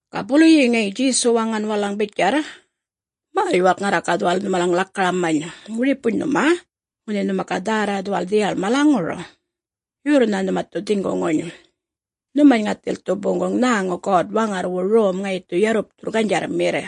Ga buluyi ŋayi Djesu waŋan walalaŋ bitjarr, “Märr-yuwalk ŋarra ga dhuwal nhumalaŋ lakaramany. Wiripuny nhuma, ŋunhi nhuma ga dhärra dhuwal dhiyal malaŋur, yorrnha nhuma dhu dhiŋguŋuny, nhumany ŋathil dhu boŋguŋ nhäŋu God-Waŋarrwu Rom ŋayi dhu yarrupthurr ganydjarrmirr.”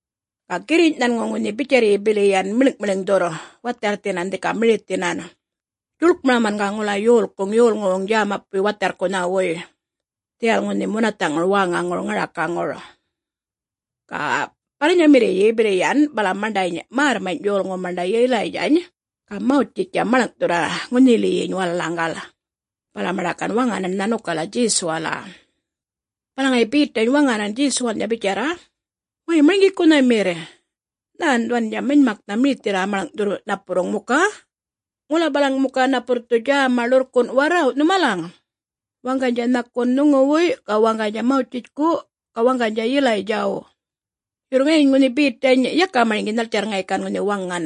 Ga girriny' nhanŋu ŋunhi bitjarryi bili yan miḻŋ'-miḻŋdhurr watharrthinan dhika mirithinan, djuḻkmaraman ga ŋula yolkuŋ yolŋuwuŋ djämapuy watharrkunhawuy dhiyal ŋunhi munatha'ŋur wäŋaŋur ŋarakaŋur. Ga balanyamirriyyi bili yan bala maṉḏany märrmany' yolŋu maṉḏa Yilaydjany ga Mawtjitjtja maḻŋ'thurra ŋunhiliyiny walalaŋgal, bala maṉḏa gan waŋanan nhanukala Djesuwala. Bala ŋayi Betany waŋanan Djesuwalnydja bitjarra, “Way Marŋgikunhamirr! Nhän dhuwandja manymaknha mirithirra maḻŋ'thurr napurruŋ muka. Ŋula balaŋ muka napurr dhu djäma ḻurrkun' warraw', nhumalaŋ, waŋganydja nhakun nhuŋuwuy, ga waŋganydja Mawtjitjku, ga waŋganydja Yilaydjaw.” Yurr ŋayiny ŋunhi Betany yaka marŋgi nhaltjarr ŋayi gan ŋunhi waŋan,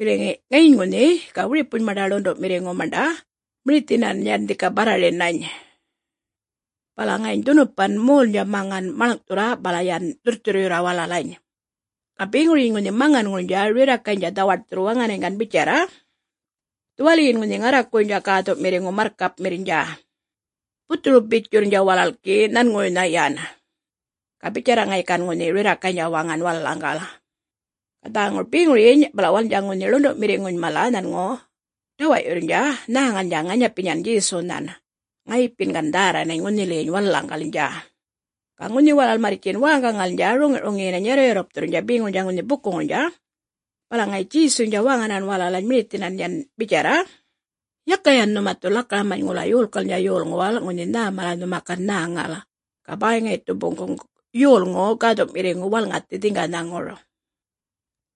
bili ŋayiny ŋunhi, ga wiripuny maṉḏa ḻundu'mirriŋu maṉḏa mirithinan yan dhika barrarinany. Bala ŋayiny dhunupan molnydja maŋan maḻŋ'thurra bala yan dhurrthurryurra walalany. Ga beŋuryiny ŋunhi maŋanŋurnydja rirrakaynydja dhawaṯthurr waŋanany gan bitjarra, “Dhuwaliyin ŋunhi ŋarrakuwuynydja Gäthu'mirriŋu, marrkapmirrnydja. Buthuru-bitjurrnydja walal gi nhanŋuwuynha yan.” Ga bitjarra ŋayi gan ŋunhi rirrakaynydja waŋan walalaŋgal. Ga dhäŋur beŋuryiny bala walalnydja ŋunhi ḻundu'mirriŋuny mala nhanŋu ḏawa'yurrnydja nhäŋalnydja ŋanyapinyan Djesunhan, ŋayipin gan dhärranany ŋunhiliyiny walalaŋgalnydja. Ga ŋunhi walal marrtjin wäŋgaŋalnydja roŋi'-ruŋiyinany yarru'-yarrupthurrnydja beŋuryiny ŋunhi bukuŋurnydja, bala ŋayi Djesuynydja waŋanan walalany mirithinan yan bitjarra, “Yaka yan nhuma dhu lakaramany ŋula yolkalnydja yolŋuwal ŋunhi nhä mala nhuma gan nhäŋal, ga bäy ŋayi dhu boŋguŋ Yolŋu Gäthu'mirriŋu walŋathi dhiŋganhaŋur.”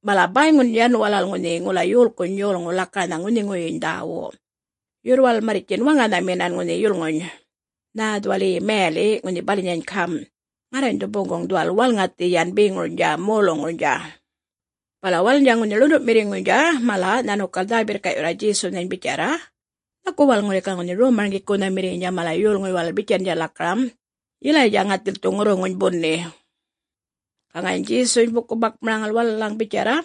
Bala bäyŋun yan walal ŋunhi ŋula yolkuny yolŋuw lakaranha ŋunhiŋuwuyyiny dhäwu. Yurr walal marrtjin waŋanhaminan ŋunhi yulŋuny nhä dhuwal mayali' ŋunhi balanyany gam', “Ŋarrany dhu boŋguŋ dhuwal walŋathi yan beŋurnydja moluŋurnydja.” Bala walalnydja ŋunhi ḻundu'mirriŋuynydja mala nhanukal dhä-birrka'yurra Djesunhany bitjarra, “Nhaku walal ŋuli ga ŋunhi Rom-marŋgikunhamirriynydja mala yolŋuy walal bitjandja lakaram, ‘Yilaydja ŋathil dhu ŋurruŋuny buni.’” Ga ŋayiny Djesuny buku-bakmaraŋal walalaŋ bitjarra,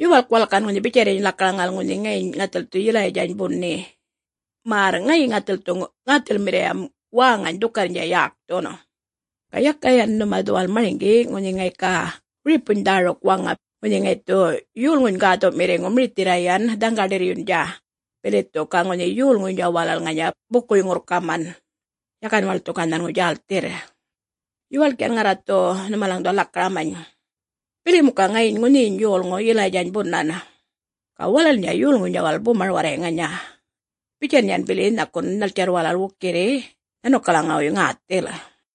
“Yuwalk walal gan ŋunhi bitjarryiny lakaraŋal ŋunhi ŋayiny ŋathil dhu Yilaydjany buni, märr ŋayi ŋathil dhu ŋäthilmirriyam waŋany dhukarrnydja yäkthun. Ga yaka yan nhuma dhuwal marŋgi ŋunhi ŋayi ga wiripuny dhäruk ŋunha waŋa, ŋunhi ŋayi dhu Yolŋuny Gäthu'mirriŋu mirithirra yan dhaŋga-ḏirryundja bili dhu ga ŋunhi yolŋuynydja walal ŋanya bukuy-ŋurrkaman, yakan walal dhu ga nhanŋu djälthirr.” Yuwalk yan ŋarra dhu nhumalaŋ dhuwal lakaramany, “Bili muka ŋayiny ŋunhiyiny yolŋu Yilaydjany bunan, ga walalnydja yolŋuynydja walal bumar warray ŋanya, bitjan yan bili nhakun nhaltjarr walal wukirri nhanukalaŋuwuy ŋäthil.”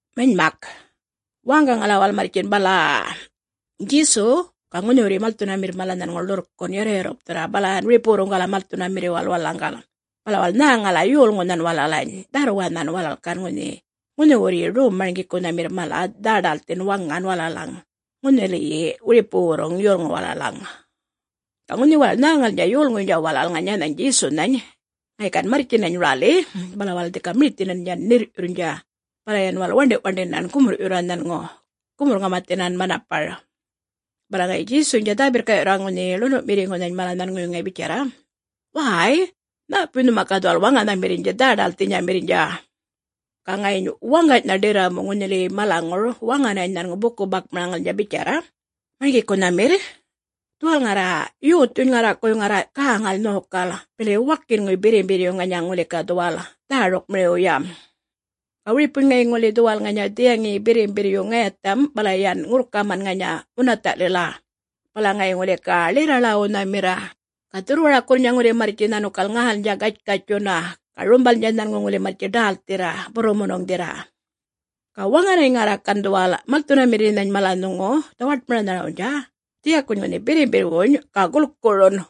Manymak, wäŋgaŋala walal marrtjin bala-a-a, Djesu ga ŋunhiwurryi malthunamirr mala nhanŋu ḻurrkun' yarru'-yarrupthurra balan wiripuwurruŋgala malthunamirriwal walalaŋgal, bala walal nhäŋala yolŋunhan walalany dharrwanhan, ga walal gan ŋunhi ŋunhiwurryi Rom-marŋgikunhamir mala dhä-ḏälthin waŋan walalaŋ ŋunhiliyi wiripuwurruŋ yolŋuw walalaŋ. Ga ŋunhi walal nhäŋalnydja yolŋuynydja walal ŋanyanhany Djesunhany ŋayi gan marrtjinany räli, bala walal dhika mirithinan yan ṉirr'yurrnydja, bala yan walal waṉḏi'-waṉḏinan gumurr'yurra nhanŋu gumurr-ŋamathinan manapar. Bala ŋayi Djesuynydja dhä-birrka'yurra ŋunhi ḻundu'mirriŋunhany mala nhanŋuwuy ŋayi bitjarra, “Wäy, nhäpuy nhuma ga dhuwal waŋanhamirrnydja dhä-ḏälthinyamirrnydja.” Ga ŋayiny waŋganynha ḏirramu ŋunhiliyi malaŋur waŋanany nhanŋu buku-bakmaraŋalnydja bitjarra, “Marŋgikunhamirr, dhuwal ŋarra yothuny ŋarrakuwuy ŋarra gäŋal nhokal bili wakinŋuy birrimbirr ŋanya ŋuli ga dhuwal dhärukmiriwyam. Ga wiripuny ŋayi ŋuli dhuwal ŋanya dhiyaŋiyi birrimbirr ŋayatham bala yan ŋurrkaman ŋanya munatha'lila, bala ŋayi ŋuli ga ḻirra-ḻäwunhamirra, ga dhurrwarakurrnydja ŋuli marrtji nhanukal ŋälnydja gatjkatjtjunna ga rumbalnydja nhanŋu ŋuli marrtji ḏälthirra, burrumunuŋdhirra. Ga waŋanany ŋarra gan dhuwal malthunamirrinhany mala nhuŋu dhawaṯmaranharawnydja dhiyakuny ŋunhi birrimbirrwuny, ga gulkurun.”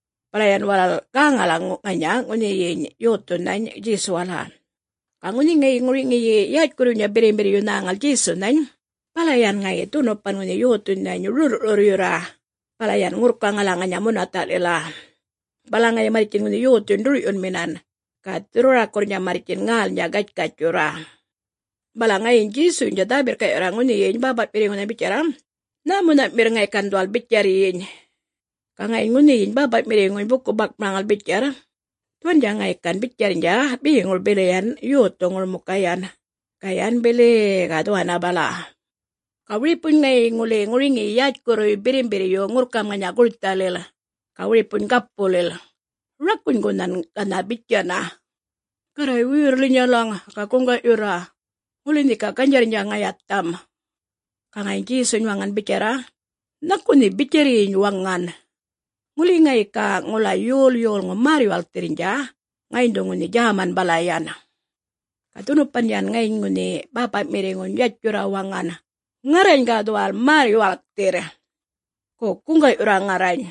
bala yan walal gäŋala ŋanya ŋunhiyiny yothunhany Djesuwala. Ga ŋunhi ŋayi ŋuriŋiy yätjkurruynydja birrimbirryu nhäŋal Djesunhany, bala yan ŋayi dhunupan ŋunhi yothunhany rurr'rurryurra bala yan ŋurrkaŋala ŋanya munatha'lila, bala ŋayi marrtjin ŋunhi yothuny ḏur'yunminan ga dhurrwarakurrnydja marrtjin ŋälnydja gatjkatjtjurra. Bala ŋayiny Djesuynydja dhä-birrka'yurra ŋunhiyiny bäpa'mirriŋunhany bitjarra, “Nhämunha'mirr ŋayi gan dhuwal bitjarryiny?” Ga ŋayiny ŋunhiyiny bäpa'mirriŋuny buku-bakmaraŋal bitjarr, “Dhuwandja ŋayi gan bitjarrnydja beŋur bili yan yothuŋur muka yan, ga yan bili-i-i ga dhuwanna bala. Ga wiripuny ŋayi ŋuli ŋuriŋiyi yätjkurruy birrimbirryurr ŋurrkam ŋanya gurthalil, ga wiripuny gapulil, rakunygunhan ganha bitjana. Garray wuyurra linyalaŋ, ga guŋga'yurra. Ŋuli nhe ga ganydjarrnydja ŋayatham.” Ga ŋayiny Djesuny waŋan bitjarr, “Nhaku nhe bitjarryiny waŋan. Ŋuli ŋayi ga ŋula yol yolŋu märr-yuwalkthirrnydja, ŋayiny dhu ŋunhi djäman bala yan.” Ga dhunupan yan ŋayiny ŋunhi bäpa'mirriŋuny yatjurra waŋan, “Ŋarrany ga dhuwal märr-yuwalkthirr. Go guŋga'yurra ŋarrany,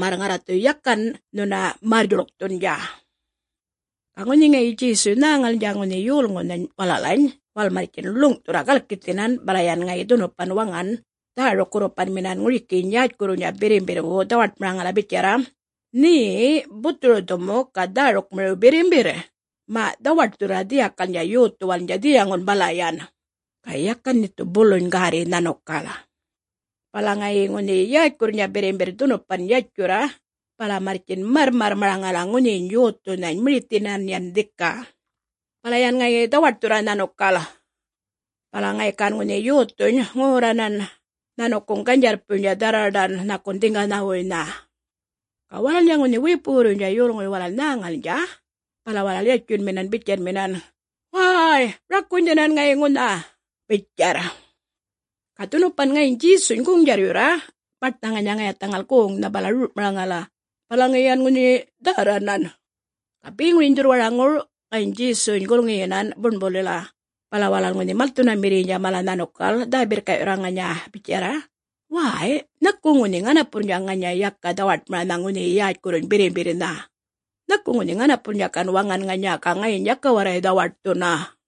märr ŋarra dhu yakan nhuna märr-yuḻkthundja.” Ga ŋunhi ŋayi Djesuy nhäŋalnydja ŋunhi yolŋunhany walalany walal marrtjin ḻuŋ'thurra galkithinan, bala yan ŋayi dhunupan waŋanan dhäruk-gurrupanminan ŋurikiyiny yätjkurruwnydja birrimbirrwu dhawaṯmaraŋala bitjarra, “Nhe buthuru-dhumuk ga dhärukmiriw birrimbirr, ma' dhawaṯthurra dhiyakalnydja yothuwalnydja dhiyaŋun bala yan, ga yakan nhe dhu buluny gärri nhanukal.” Bala ŋayi ŋunhi yätjkurrnydja birrimbirr dhunupan yatjurra bala marrtjin marrmarrmaraŋala ŋunhiyiny yothunhany mirithinan yan dhika, bala yan ŋayi dhawaṯthurra nhanukal. Bala ŋayi gan ŋunhi yothuny ŋorranan nhanukuŋ ganydjarrpuynydja dharraḏan nhakun dhiŋganhawuynha. Ga walalnydja ŋunhi wiripuwurruynydja yolŋuy walal nhäŋalnydja bala walal yatjunminan bitjanminan, “Wäy rakunydhinan ŋayi ŋunha,” bitjarr. Ga dhunupan ŋayiny Djesuny goŋ-djarryurra baṯnha ŋanya ŋayathaŋal goŋnha bala rur'maraŋala, bala ŋayi yan ŋunhi dhärranan. Ga beŋuryiny dhurrwaraŋur ŋayiny Djesuny gulŋiyinan buṉbulila, bala walal ŋunhi malthunamirriynydja mala nhanukal dhä-birrka'yurra ŋanya bitjarr, “Wäy nhaku ŋunhi ŋanapurrnydja ŋanya yaka dhawaṯmaranha ŋunhiyi yätjkurruny birrimbirrnha. Nhaku ŋunhi ŋanapurrnydja gan waŋan ŋanya, ga ŋayiny yaka warray dhawaṯthunna.”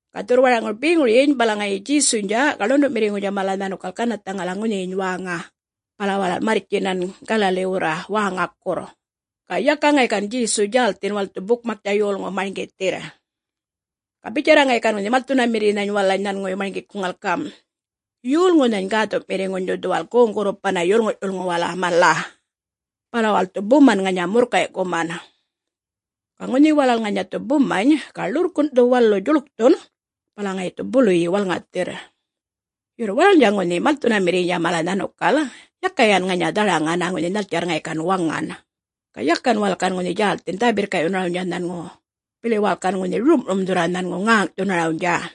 Ga dhurrwaraŋur beŋuryiny bala ŋayi Djesuynydja ga ḻundu'mirriŋuynydja mala nhanukal ganarrthaŋala ŋunhiyiny wäŋa, bala walal marrtjinan Galaliwurra wäŋakurr, ga yaka ŋayi gan Djesu djälthin walal dhu bukmaktja yolŋu marŋgithirr. Ga bitjarra ŋayi gan ŋunhi malthunamirrinhany walalany nhanŋuwuy marŋgikuŋal gam', “Yolŋunhany Gäthu'mirriŋuny dhu dhuwal goŋ-gurrupanna yolŋu'-yulŋuwala mala. Bala walal dhu buman ŋanya murrkay'kuman. Ga ŋunhi walal ŋanya dhu bumany, ga ḻurrkun' dhu walu djuḻkthun, bala ŋayi dhu buluyi walŋathirr.” Yurr walalnydja ŋunhi malthunamirriynydja mala nhanukal yaka yan ŋanya dharaŋana ŋunhi nhaltjarr ŋayi gan waŋan, ga yakan walal gan djälthin dhä-birrka'yunarawnydja nhanŋu, bili walal gan ŋunhi rum'rumdhurra nhanŋu ŋäŋ'thunarawnydja.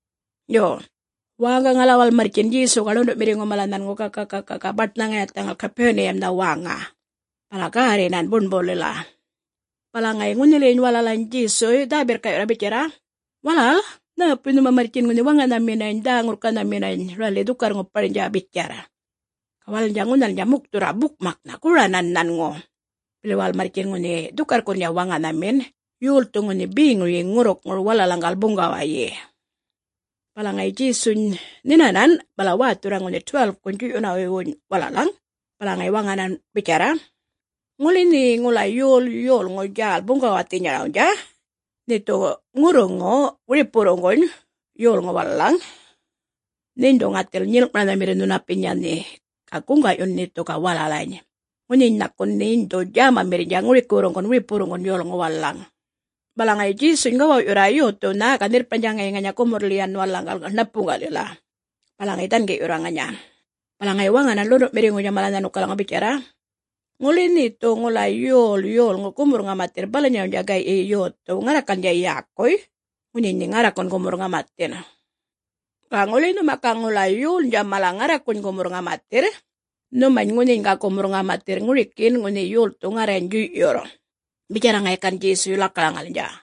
Yo, … wäŋgaŋala walal marrtjin Djesu ga ḻundu'mirriŋu mala nhanŋu ga-ga-ga baṯnha ŋayathaŋal Gapuniyamnha wäŋa, bala gärrinan buṉbulila. Bala ŋayi ŋunhiliyiny walalany Djesuy dhä-birrka'yurra bitjarra, “Walal nhäpuy nhuma marrtjin ŋunhi waŋanhaminany dhä-ŋurrkanhaminany räli dhukarr-ŋuparnydja?” bitjarr. Ga walalnydja ŋunhalnydja mukthurra bukmaknha goranan nhanŋu, bili walal marrtjin ŋunhi dhukarrkurrnydja waŋanhamin, yol dhu ŋunhi beŋuryi ŋurrukŋur walalaŋgal buŋgawayi. Bala ŋayi Djesuny nhinanan, bala wäthurra ŋunhi 12-kuny djuy'yunawuywuny walalaŋ, bala ŋayi waŋanan bitjarra, “Ŋuli nhe ŋula yol yolŋu djäl buŋgawathinyarawnydja, nhe dhu ŋurruŋuyirr wiripuwurruŋguny yolŋuw walalaŋ, nheny dhu ŋathil nyilŋ'maranhamirr nhunapinya nhe, ga guŋga'yun nhe dhu ga walalany, ŋunhiny nhakun nheny dhu djämamirrnydja ŋurikiwurruŋguny wiripuwurruŋguny yolŋuw walalaŋ.” Bala ŋayi Djesuny gawaw'yurra yothuwnha ga nhirrparnydja ŋayi ŋanya gumurrlil yan walalaŋgal ṉapuŋga'lila, bala ŋayi dhangi'yurra ŋanya, bala ŋayi waŋanan ḻundu'mirriŋuwnydja mala nhanukalaŋaw bitjarr, “Ŋuli nhe dhu ŋula yol yolŋu gumurr-ŋamathirr balanyarawnydja gay'yi yothuw ŋarrakalnydja yäkuy, ŋunhiyiny nhe ŋarrakun gumurr-ŋamathin. Ga ŋuli nhuma ga ŋula yolnydja mala ŋarrakuny gumurr-ŋamathirr, nhumany ŋunhiny ga gumurr-ŋamathirr ŋurikin ŋunhi yolthu ŋarrany djuy'yurr,” bitjarra ŋayi gan Djesuy lakaraŋalnydja.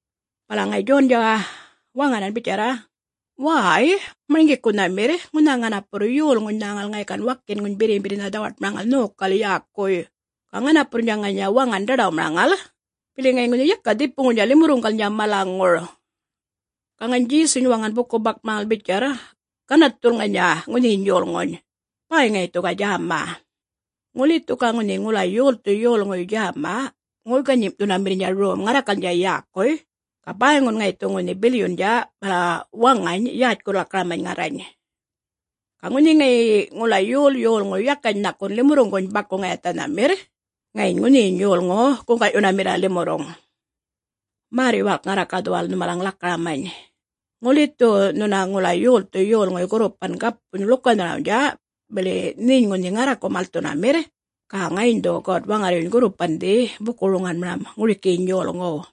Bala ŋayi Djondja waŋanan bitjarra, “Way Marŋgikunhamirr, ŋunha ŋanapurr yolŋuny nhäŋal ŋayi gan wakinŋuny birrimbirrnha dhawaṯmaraŋal nhokal yäkuy, ga ŋanapurrnydja ŋanya waŋan ḏaḏawmaraŋala, bili ŋayi ŋunhi yaka dhipuŋurnydja limurruŋgalnydja malaŋur.” Ga ŋayiny Djesuny waŋan buku-bakmaraŋal bitjarr, “Ganarrthul ŋanya ŋunhiyiny yolŋuny, bäy ŋayi dhu ga djäma. Ŋuli dhu ga ŋunhi ŋula yolthu yolŋuy djäma ŋoy-ganyim'thunamirrnydja rom ŋarrakalnydja yäkuy, ga bäyŋun ŋayi dhu ŋunhi bilyundja bala waŋany yätjkurr-lakaramany ŋarrany. Ga ŋunhi ŋayi ŋula yol yolŋu yakany nhakun limurruŋguny baku-ŋayathanhamirr, ŋayiny ŋunhiyiny yolŋu guŋga'yunamirra limurruŋ. Märr-yuwalk ŋarra ga dhuwal nhumalaŋ lakaramany, ŋuli dhu nhuna ŋula yolthu yolŋuy gurrupan gapuny ḻukanharawnydja, bili nheny ŋunhi ŋarraku malthunamirr, ga ŋayiny dhu God-Waŋarryuny gurrupandhi buku-roŋanmaram ŋurikiyiny yolŋuw.”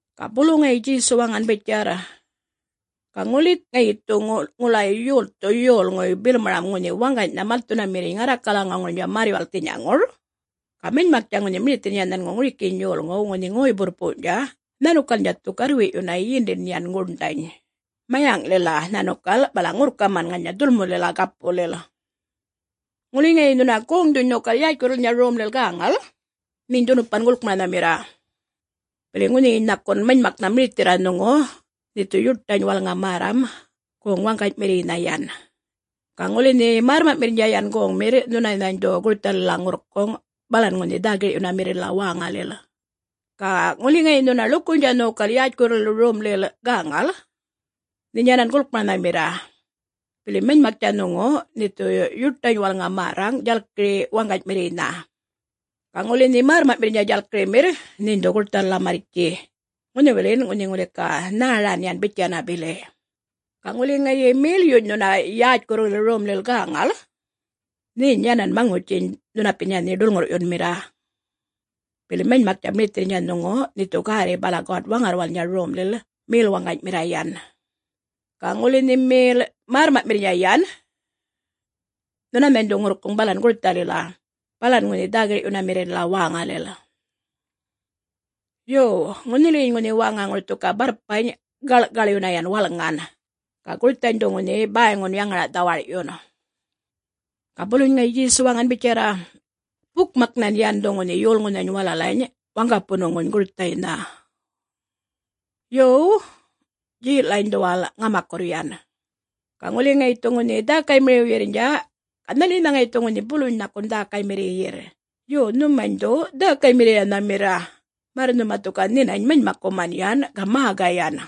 Ga bulu ŋayi Djesu waŋan bitjarr, “Ga ŋuli ŋayi dhu ŋula yolthu yolŋuy bilmaram ŋunhi waŋganynha malthunamirriny ŋarrakalaŋuŋurnydja märr-yuwalkthinyaŋur, ga manymaktja ŋunhi mirithirrnydja nhanŋu ŋurikiyiny yolŋuw ŋunhi ŋoy-burrpuwny'tja nhanukalnydja dhu garrwi'yunna yindin yan guṉḏany mayaŋlila nhanukal bala ŋurrkaman ŋanya dhulmulila gapulil. Ŋuli ŋayi nhuna goŋdhuny nhokal yätjkurrulilnydja romlil gäŋal, nheny dhunupan gulkmaranhamirra. Bili ŋunhiyiny nhakun manymaknha mirithirra nhuŋu nhe dhu yuṯany walŋa märram goŋ-waŋganymirriynha yan, ga ŋuli nhe märrma'mirrnydja yan goŋmirr nhunanhany dhu gurthalila ŋurrkuŋ balan ŋunhi dhä-gir'yunamirrilila wäŋalil. Ga ŋuli ŋayi nhuna ḻukuynydja nhokal yätjkurrulil romlil gäŋal, nheny dhunupan gulkmaranhamirra. Bili manymaktja nhuŋu nhe dhu yuṯany walŋa märraŋ djalkiri waŋganymirriynha. Ga ŋuli nhe märrma'mirrnydja djalkirimirr, nheny dhu gurthalila marrtji ŋunhiwilin ŋunhi ŋuli ga nhäran yan bitjanna bili. Ga ŋuli ŋayi melyuny nhuna yätjkurrulil romlil gäŋal, nheny yanan maŋutjiny nhunapinya nhe ḏulŋurr'yunmirra. Bili manymaktja mirithirrnydja nhuŋu nhe dhu gärri bala God-Waŋarrwalnydja romlil mel waŋganymirra yan, ga ŋuli nhe mel märrma'mirrnydja yan, nhunanhany dhu ŋurrkuŋ balan gurthalila, balan ŋunhi dhä-gir'yunamirrilila wäŋalil. Yo, ŋunhiliyiny ŋunhi wäŋaŋur dhu ga barrpany' gaḻ'kaḻyunna yan walŋan, ga gurthany dhu ŋunhi bäyŋun yaŋara'-dhawar'yun.” Ga buluny ŋayi Djesu waŋan bitjarra, “Bukmaknhan yan dhu ŋunhi yolŋunhany walalany waŋgapunuŋuny gurthaynha.” “Yo, dje'lany dhuwal ŋamakurr yan. Ga ŋuli ŋayi dhu ŋunhi dhäkaymiriwyirrnydja, ga nhaliynha ŋayi dhu ŋunhi buluny nhakun dhäkaymirriyirr? Yo, nhumany dhu dhäkaymirriyanhamirra, märr nhuma dhu ga nhinany manymakkuman yan ga mägayan.”